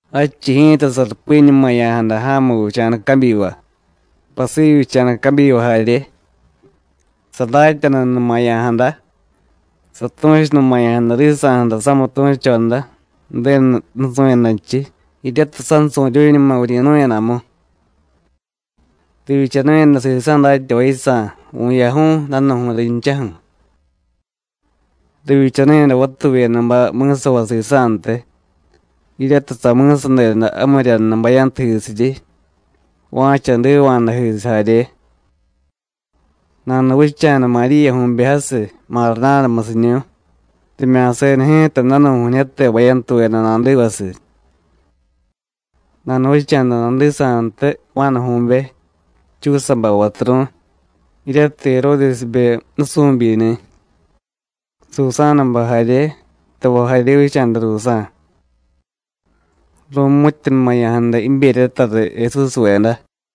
Jadchiy ji̱ta sarupiñumaya̱jada ja̱mu vicha̱da cabyiva, pasivyicha̱da cabyiva jarye. Sadatyanunumaya̱jada, satu̱chunumaya̱jada risa̱ju̱ra samitu̱choda Ju̱denu nusu̱yadanchiy, jiryatiy sansu̱ryu̱ñuma vuryi̱nu̱yadamu. Rivyichanu̱yada sisa̱ datyavay yisa̱ vu̱yaju̱y, danu̱ju̱y rinchaju̱. Rivyichanu̱yada vatuvyedabay mi̱savay sisa̱ntiy, jiryatiy sami̱sadeda jamiryanu bayantujisiryi, va̱cha jdiva̱jadajisiy jarye. Nanuvicha̱da Maríyaju̱be jasiy, Mardánamusiñu̱y, rimya̱seda ji̱ta danu̱ju̱ñijyate bayantuveda nadivasiy. Nanuvicha̱da nadisa̱ntiy Juánaju̱be, Chúsabay vaturu̱y, jiryatiy Jeródesbe nusu̱byini̱, Susánabay jarye, tavay jarye vicha̱da ruusa̱. Ru̱mu̱tyanumaya̱jada jiberyata riy Jesúsveda.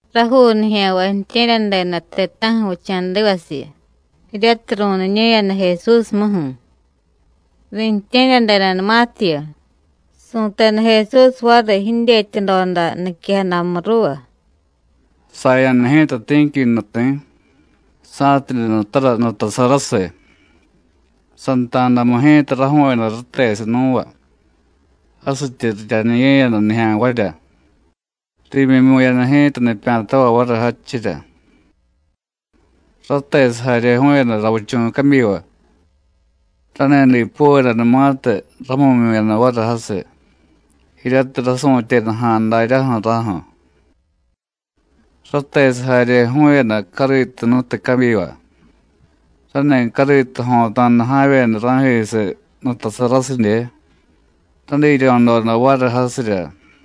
Rajuu nijya̱nvay ju̱tye̱ryadeda ti̱ta̱ju̱ vicha̱divasiyu, jiryatiy ru̱niñu̱yada Jesúsmuju̱. Riintye̱ryadedanumatiyu, su̱teda Jesús variy jidyetyadoda niquejadamu ruuva: “Saya̱da ji̱ta ti̱qui nuti̱, sa̱tidye nutara nutasarasiy. Santa̱damu ji̱ta raju̱u̱yada ratesiy nú̱va, jasityi riryaniye̱yada nijya̱nvarya, riimyimyu̱yada ji̱ta nipya̱tavay variy jadchirya. Ratesiy jarye ju̱u̱yada ravichu̱ cabyiva. Rani dipuvedanumatiy ramu̱myu̱yada variy jasiy, jiryatiy rasu̱tyeda ja̱a̱ daryaju̱ raju̱. Ratesiy jarye ju̱u̱yada cariitujnutiy cabyiva, rani̱ cariitu jo̱ta̱da ja̱vyeda ra̱jisiy nutasarasidye, radiryo̱doda variy jasirya.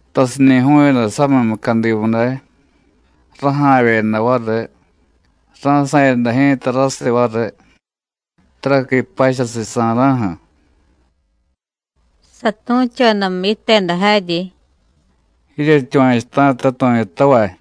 Tasiñi̱ ju̱u̱yada samiy mucadimu day, raja̱vyeda variy, ra̱sa̱yada ji̱ta rasiy variy, taraqui pachasiy sa̱ra̱ju̱.” Satu̱chodamu yiteda jaryi: “Jiryetyuva̱chuta̱ta tu̱yutavay.”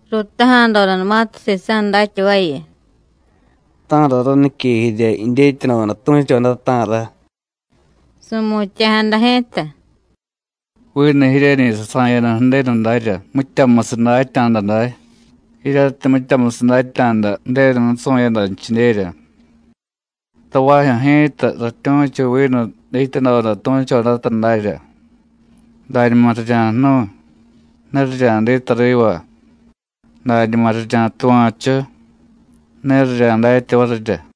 Ruutaja̱dodanumatiy sisa̱ datyavayu: “¿Ta̱ra ranique jirya jidyetyadoda tu̱choda, ta̱ra?” Su̱mutya̱jada ji̱ta: “Vinu jiryeñiy sasa̱yada Ju̱denu darya mityamusiy datya̱da day, jiryatiy mityamusiy datya̱da Ju̱denu nusu̱yadanchidyerya; tavajyu̱ ji̱ta ratyu̱chu vinu dityadoda tu̱chodata dárya, dañuma rirya̱jnu̱y, ne rirya̱diy tariva; dañuma rirya̱tuva̱chu, ne rirya̱datya varirya.”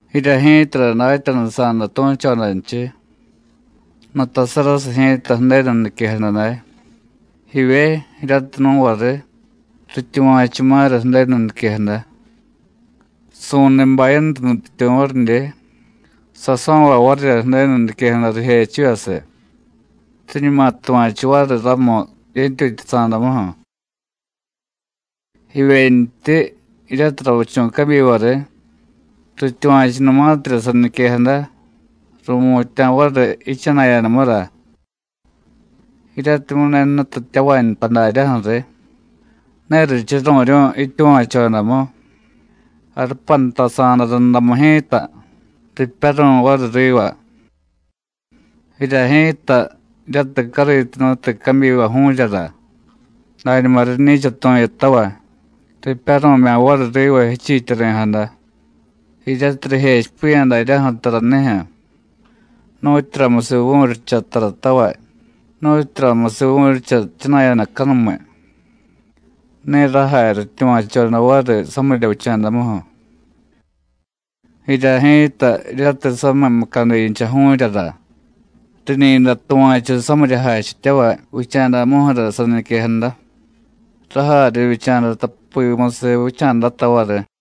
“Jirya ji̱tara datyanusa̱da tu̱chodanchiy: Nutasarasiy ji̱ta Ju̱denu niquejada day. Jivye jiryatiy nú̱va riy, rityuva̱chuma̱ra Ju̱denu niquejada. Su̱niy bayantu nutyityu̱ varidye, saso̱vay varirya Ju̱denu niquejada rijechivyasiy, riñuma tuva̱chu variy ramu yentyutyasa̱damuju̱. Jivyentyi jiryatiy ravichu̱ cabyiva riy, rityuva̱chunumatirya saniquejada, ru̱mutya̱ variy jichana̱yadamura. Jiryatimyu̱ ne jnutityavay nta daryaju̱ riy, ne richuru̱ryu̱y jityuva̱chodamu, jarupantasa̱da rundamu ji̱ta ripyaru̱y variy riva. Jirya ji̱ta, jiryatiy cariitu jnutiy cabyiva ju̱u̱ryara, dañuma riñi̱cha tu̱yutavay, ripyaru̱mya̱ variy riva jichiityari̱jada, jiryatiy rijechipiya̱ daryaju̱ taranijyu̱, nu̱tyuramusiy vu̱ryicha taratavay, nu̱tyuramusiy vu̱ryicha jchana̱yadacanumiy. Ne rajay rityuva̱choda variy samirya vicha̱damuju̱. Jirya ji̱ta, jiryatiy samiy mucadincha ju̱u̱ryara, riñi̱day tuva̱chu samirya jachityavay vicha̱damuju̱ra saniquejada, rajay rivyicha̱da tapimusiy vicha̱data variy.”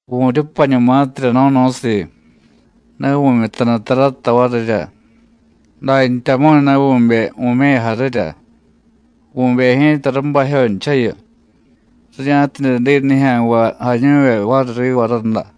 “Vu̱ryupañumatirya no̱no̱siiy, ne vu̱myutanu tarata varirya, dantyamu̱y ne vu̱bey vu̱me̱ya jarirya. Vu̱bey ji̱ta rabajyonchayu, rirya̱tidye diy nijya̱nvay jañu̱vye variy riva rada.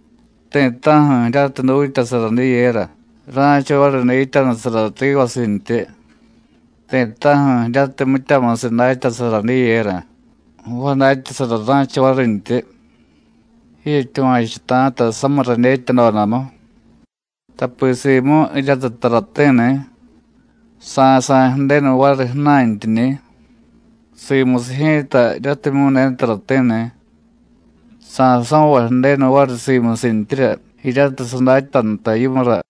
Ti̱ta̱ju̱ jiryatiy dutyasara diyera, ra̱cha variy dityanusara rivasintyi; ti̱ta̱ju̱ jiryatiy mityamusiy datyasara diyera, jvadatyasara ra̱cha varintyi. Jiryetyuva̱chuta̱ta samiy radyetyadodamu, tapi simu jiryatiy tarati̱ni̱, sa̱sa̱y Ju̱denu variy ju̱na̱ntyiñi̱; simusiy ji̱ta jiryatimyu̱ ne tarati̱ni̱, sa̱so̱vay Ju̱denu variy simusintyirya jiryatiy sadatya nta yimura.”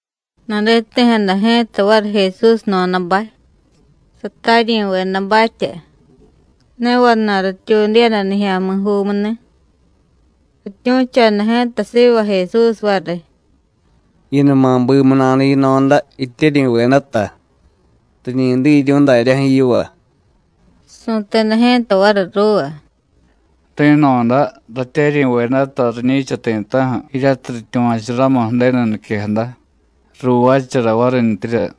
Naditi̱jada ji̱ta variy Jesús jno̱dabay, sataryi̱vedabatya, ne vana̱y rityuudiyada nijya̱mi̱juumuni̱. Rityu̱choda ji̱ta siva Jesús variy: “Jiyunuma bimu nada yino̱da, jityeryi̱vedata, riñi diryu̱y daryaju̱ yiva.” Su̱teda ji̱ta variy ruuva: “Ri̱no̱da, ratyeryi̱vedata riñi̱cha ti̱ta̱ju̱ jiryatiy rityuva̱chu ramu Ju̱denu niquejada, ruuvaachara varintyirya.”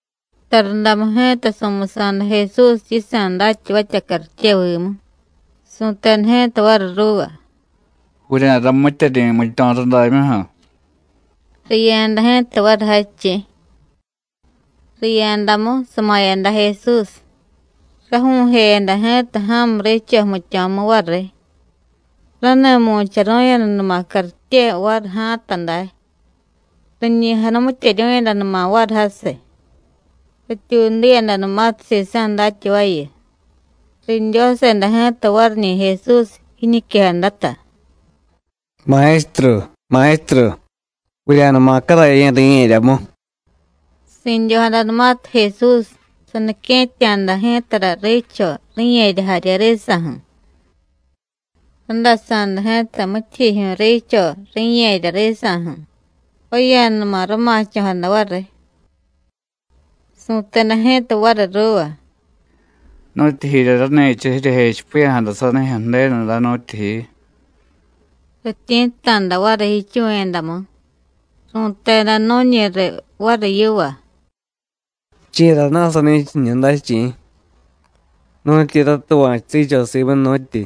Tarundamu ji̱ta su̱musa̱da Jesús yisa̱ datyavatya cartyevimu. Su̱teda ji̱ta variy ruuva: “Vurya̱ramityeryi̱ jmityo̱ rudamyuju̱.” Riya̱da ji̱ta variy jadchiy. Riya̱damu sama̱yada Jesús. Raju̱u̱jeyada ji̱ta ja̱mu riicho jmityo̱mu variy, rani mu̱charu̱yadanuma cartye variy ja̱a̱ta day, riñi janumityeryu̱yadanuma variy jasiy. Rityuudiyadanumatiy sisa̱ datyavayu, ridyoseda ji̱ta variñi̱ Jesús jiñiquejadata: “¡Maestru, Maestru, vurya̱numa caraye̱ ri̱ye̱ryamu!” Si̱dyojadanumatiy Jesús, sanique̱tya̱da ji̱tara riicho, ri̱ye̱rya jarye risa̱ju̱. Randasa̱da ji̱ta mityijyijyu̱y riicho, ri̱ye̱rya risa̱ju̱, ju̱vaya̱numa rama̱cho̱jada variy. Su̱teda ji̱ta variy ruuva: “¿Nu̱tyijirya rani̱cha jiryejechipiya̱jada sanijyu̱ Ju̱denu day, nu̱tyijiy?” Rityi̱tta̱da variy jichuvu̱yadamu, ru̱teda nu̱ñi riy variy yiva: “¿Chi̱rana̱ sani̱cha jiñu day, chi̱? ¿Nu̱tyi ratuva̱chu riicho simu, nu̱tyi,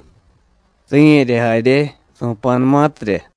ri̱ye̱rya jarye, su̱pa̱numatirya?”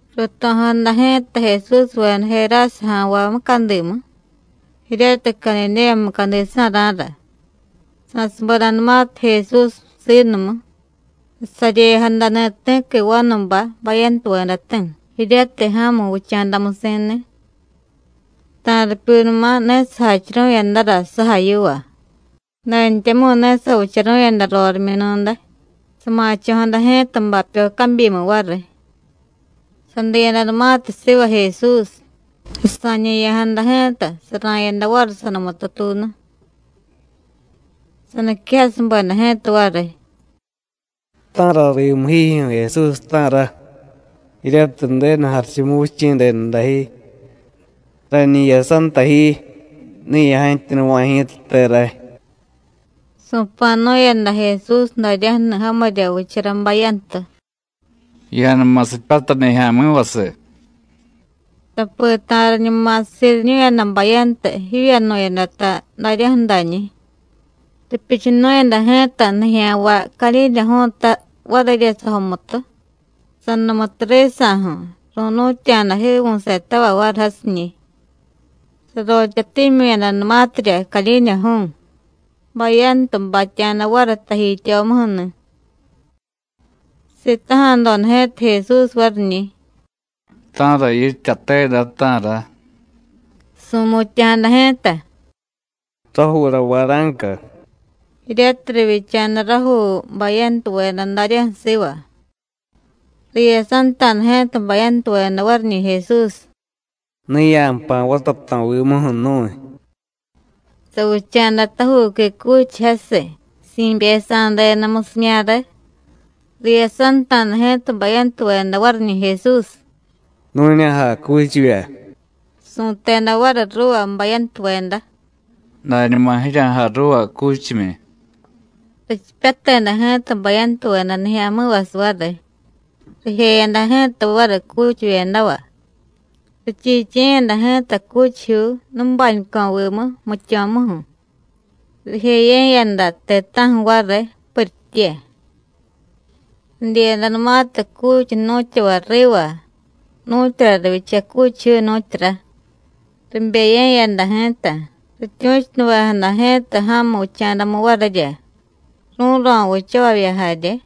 Ruuto̱jada ji̱ta Jesúsveda Jerásaja̱nvay mucadimu, jiryatiy Cadidéya mucadisa̱ra̱ra. Sa̱subedanumatiy Jesús siinumu, sasaryejadani̱ ti̱qui vanubay bayantuvedati̱, jiryatiy ja̱mu vicha̱damusi̱ni̱. Ta̱ripyunuma ne sajachuru̱yadara sujay yiva, dantyamu̱y ne savicharu̱yada rorimyunu̱day, sama̱cho̱jada ji̱ta bapyo cabyimu variy. Sadiyadanumatiy siva Jesús, sasa̱ñe̱ya̱jada ji̱ta, sara̱yada variy sanumututuunu. Saniquejasubeda ji̱ta variy: “¿Ta̱ra rimu jiijyu̱ Jesús, ta̱ra? jiryatiy Ju̱denu Jarichumuvichi̱ denu dajyi. Rañi jiyasanta ji, ne ya̱jantyunuva̱y ji̱tate ray.” Su̱pa̱nu̱yada Jesús daryaju̱ni̱ jamirya vichara bayantu: “¡Ya̱numa sipyatay nijya̱mi̱vasiy!” Tapi ta̱riñuma siriñu̱yada bayantu jivyanu̱yadata daryaju̱dañi̱. Ripyuchunu̱yada ji̱ta nijya̱nvay cadyidyaju̱u̱ta varirya sajomutu, sanumutu risa̱ju̱, ru̱nu̱tya̱da jiivu̱setavay variy jasiñi̱. Sarotyatimyu̱yadanumatirya cadyidyaju̱u̱, bayantu batya̱da variy tajityomuju̱ni̱. Sitaja̱doda ji̱ta Jesús variñi̱: “¿Ta̱ra yityate day, ta̱ra?” Su̱mutya̱jada ji̱ta: “Rajuura Vara̱nca,” jiryatiy rivyicha̱da rajuu bayantuveda daryaju̱ siva. Riyasanta̱da ji̱ta bayantuveda variñi̱ Jesús: “Ne ya̱jpa̱ vatato̱vimuju̱ nu̱y.” Savicha̱da tajuuqui cuchiy jasiy, si̱byesa̱deda musimyare. Riyasanta̱da ji̱ta bayantuveda variñi̱ Jesús: “Nu̱ña̱jay cuchivya.” Su̱teda variy ruuva bayantuveda: “Dañuma jirya̱jay ruuva cuchimyi.” Richipyateda ji̱ta bayantuveda nijya̱mi̱vasiy variy, rijeyada ji̱ta variy cuchivyedava. Richiichiye̱yada ji̱ta cuchijyuu nubañuco̱vimu jmityo̱muju̱, rijeye̱yada ti̱ta̱ju̱ variy, puritye. Ridyiyadanumatiy cuchiy jnu̱tyavay riva, nu̱tyura rivyicha cuchijyuu, nu̱tyura, ribeye̱yada ji̱ta, rityu̱chunuvejada ji̱ta ja̱mu vicha̱damu varirya, rú̱ro̱ vichavavya jarye.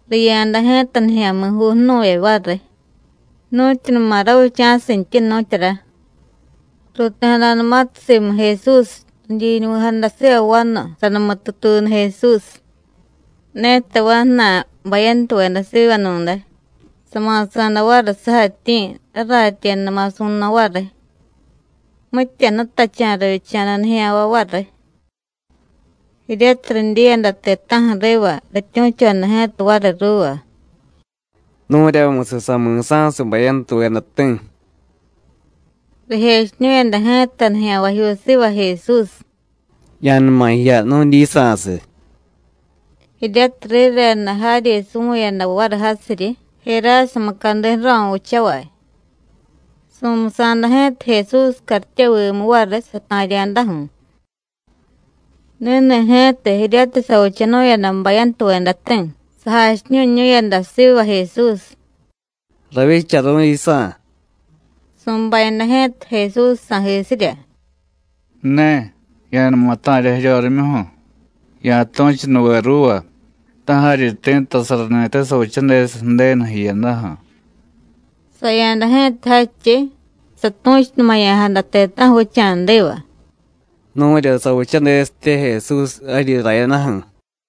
Riya̱da ji̱ta nijya̱mi̱juu jnu̱vye variy, nu̱tyunuma ravicha̱sintyi, nu̱tyura. Ruuti̱jadanumatiy simu Jesús, ridyiñuvi̱jada siva vanu sanumututuunu Jesús. Ne tavay jna̱y bayantuveda sivanu̱day, sama̱sa̱da variy sujatyi̱, raratyedama̱ su̱no̱ variy. Mitya jnutacha̱ rivyicha̱da nijya̱nvay variy. Jiryatiy ridyiyada ti̱ta̱ju̱ riva, rityu̱choda ji̱ta variy ruuva: “Nu̱ryamusiy sami̱sa̱siy bayantuvedati̱.” Rijechiñu̱yada ji̱ta nijya̱nvajyuu siva Jesús: “¡Ya̱numa jiya nu̱dyisa̱siy!” jiryatiy rireda jaryi suvu̱yada variy jasiryi Jerása mucadi ju̱ro̱ vichavay. Su̱musa̱da ji̱ta Jesús cartyevimu variy sata̱rya̱daju̱. Ni̱ni̱ ji̱ta jiryatiy savichanu̱yada bayantuvedati̱, sajachiñu̱ñu̱yada siva Jesús: “Ravyicharu̱y yisa̱.” Su̱bayada ji̱ta Jesús sa̱jisirya: “Ne, ya̱numa ta̱rya jiryorimyuju̱, ya̱tu̱chunuve ruuva, ta̱ jaryi ti̱ttasarani̱te savichadesiy Ju̱denu jiyadaju̱.” Saya̱da ji̱ta jadchiy, satu̱chunumaya̱jada ti̱ta̱ju̱ vicha̱diva: “Nu̱rya savichadesitye Jesús jaryi rayadaju̱.”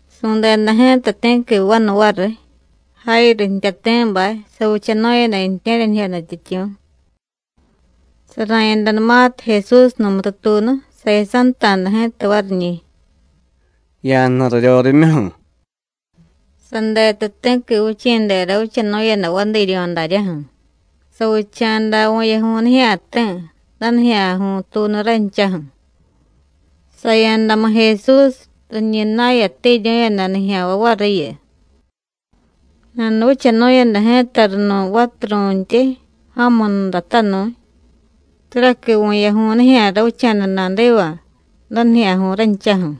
Su̱deda ji̱ta ti̱qui vanu variy, Jáyiru jtyati̱bay, savichanu̱yada ju̱tye̱ryanijyo nutyityu̱. Sara̱yadanumatiy Jesús numututuunu, sayasanta̱da ji̱ta variñi̱: “¡Ya̱jniy raryorimyuju̱!” Sadetu ti̱qui vichi̱dera vichanu̱yada vadiiryo̱ daryaju̱, savicha̱da vu̱yaju̱y nijya̱ti̱, danijya̱ju̱y tuunu ranchaju̱. Saya̱damu Jesús, riñi na̱yatiryu̱yada nijya̱nvay variyu. Nanuvichanu̱yada ji̱ta runu̱y vaturu̱ntyi, ja̱munudatanu̱y, taraqui vu̱yaju̱y nijya̱ ravicha̱da nadiva, danijya̱ju̱y ranchaju̱.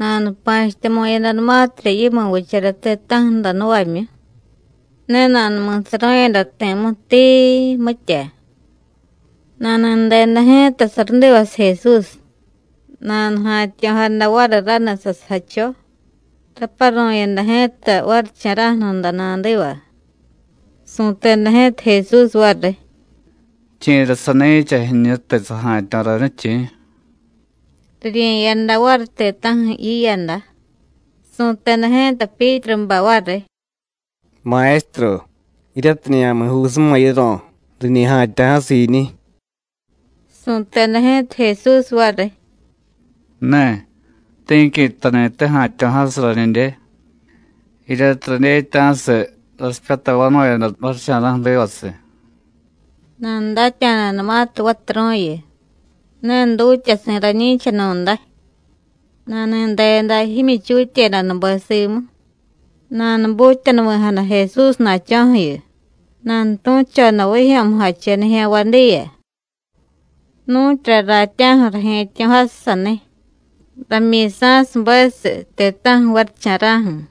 Nanupa̱chityamu̱yadanumatirya yimu vichara ti̱ta̱ju̱ jdanu̱vamyu, ne nanumi̱saru̱yada ti̱mu tiii, mitya. Nani̱deda ji̱ta sarudivasiy Jesús, nanuja̱tyo̱jada variy raniy sasujacho, raparu̱yada ji̱ta varicha̱ra̱ju̱ nuda nadiva. Su̱teda ji̱ta Jesús variy: “¿Chi̱ra sani̱cha jiñutiy saja̱tyo̱ rañiy, chi̱?” Rirye̱yada variy ti̱ta̱ju̱ jiyada, su̱teda ji̱ta Pyítrubay variy: “¡Maestru, jiryatiy nijya̱mi̱juusuma yiro̱, riñi ja̱tyo̱ jasiy jiiñiy!” Su̱teda ji̱ta Jesús variy: “Ne, ti̱qui jtani̱te ja̱tyo̱jasiy rañidye, jiryatiy radyetya̱siy rasipyatay vanu̱yada varicha̱ra̱ju̱ rivasiy.” Nanudatya̱danumatiy vaturu̱yu: “Ne dutyasi̱ rañi̱chanu̱day,” nani̱deda jimyichutyedanube simu, nanubutyanuvi̱jada Jesúsna̱cho̱ju̱yu, nanutu̱choda vijyo̱mujache nijya̱nvay diya: “Nu̱tyura ratya̱ju̱ raje̱tyo̱jasiy saniy, ramyi̱sa̱subesiy ti̱ta̱ju̱ varicha̱ra̱ju̱.”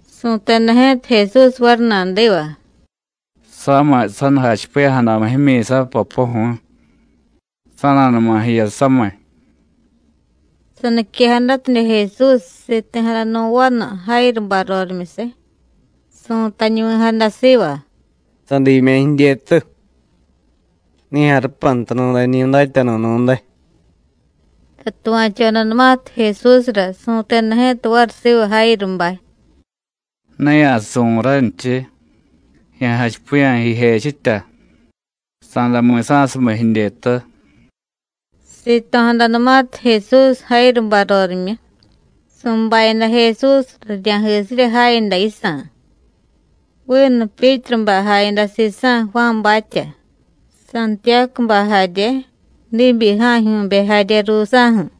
Su̱teda ji̱ta Jesús variy nadiva: “Samiy sa̱nujachipiya̱jadamu jimyi̱sa, Popoju̱y. Sa̱na̱numa jiya samiy.” Saniquejadatidye Jesús, siti̱jada nu̱ vanu Jáyirubay rorimyusiy, su̱tañuvi̱jada siva: “Sadiimya̱ jidyetu. Ne ya̱jarupanta nu̱dañi̱ Datyanu̱ nu̱day.” Satuva̱chodanumatiy Jesúsra, su̱teda ji̱ta variy siva Jáyirubay: “Ne ya̱suvu̱y ranchiy, ya̱jachipiya̱ jijechitya, sa̱day mi̱sa̱sumiy jidyetu.” Sito̱jadanumatiy Jesús Jáyirubay rorimyu, su̱bayada Jesús rirya̱jisirya jayada yisa̱. Vinu Pyítrubay jayada sisa̱, Juánbatya, Santiyácubay jarye, diibyi ja̱jyu̱be jarye ruusa̱ju̱.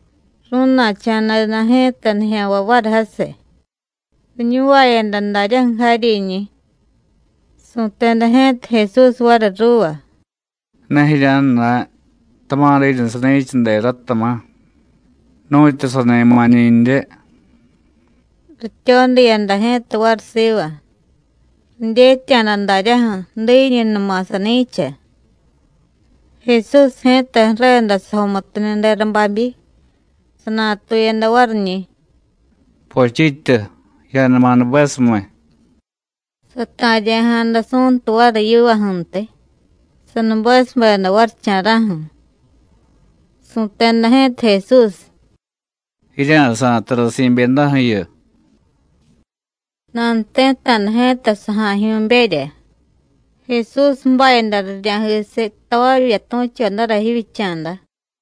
Ru̱na̱cha̱deda ji̱ta nijya̱nvay variy jasiy, riñuvayada daryaju̱ jaryiñi̱. Su̱teda ji̱ta Jesús variy ruuva: “Ne jirya̱jna̱y, tama̱ diiñu sani̱cha dera, tama̱, nu̱tyu sani ma̱ñi̱ndye.” Rityodiyada ji̱ta variy siva, ridyetya̱da daryaju̱ diiñunuma sani̱cha. Jesús ji̱ta ju̱reda sajomutuniy dera babyi, sanatuyada variñi̱: “¡Pochityu, ya̱numa nubesumiy!” Sata̱rya̱jada su̱ntu variy yivaju̱ntiy, sanubesubeda varicha̱ra̱ju̱. Su̱teda ji̱ta Jesús: “Jirya̱sa̱y tara si̱byedaju̱yu.” Nanuti̱tta̱da ji̱ta saja̱jyu̱berya; Jesús ju̱bayada rirya̱jisiy tavavya tu̱chodara jivyicha̱da.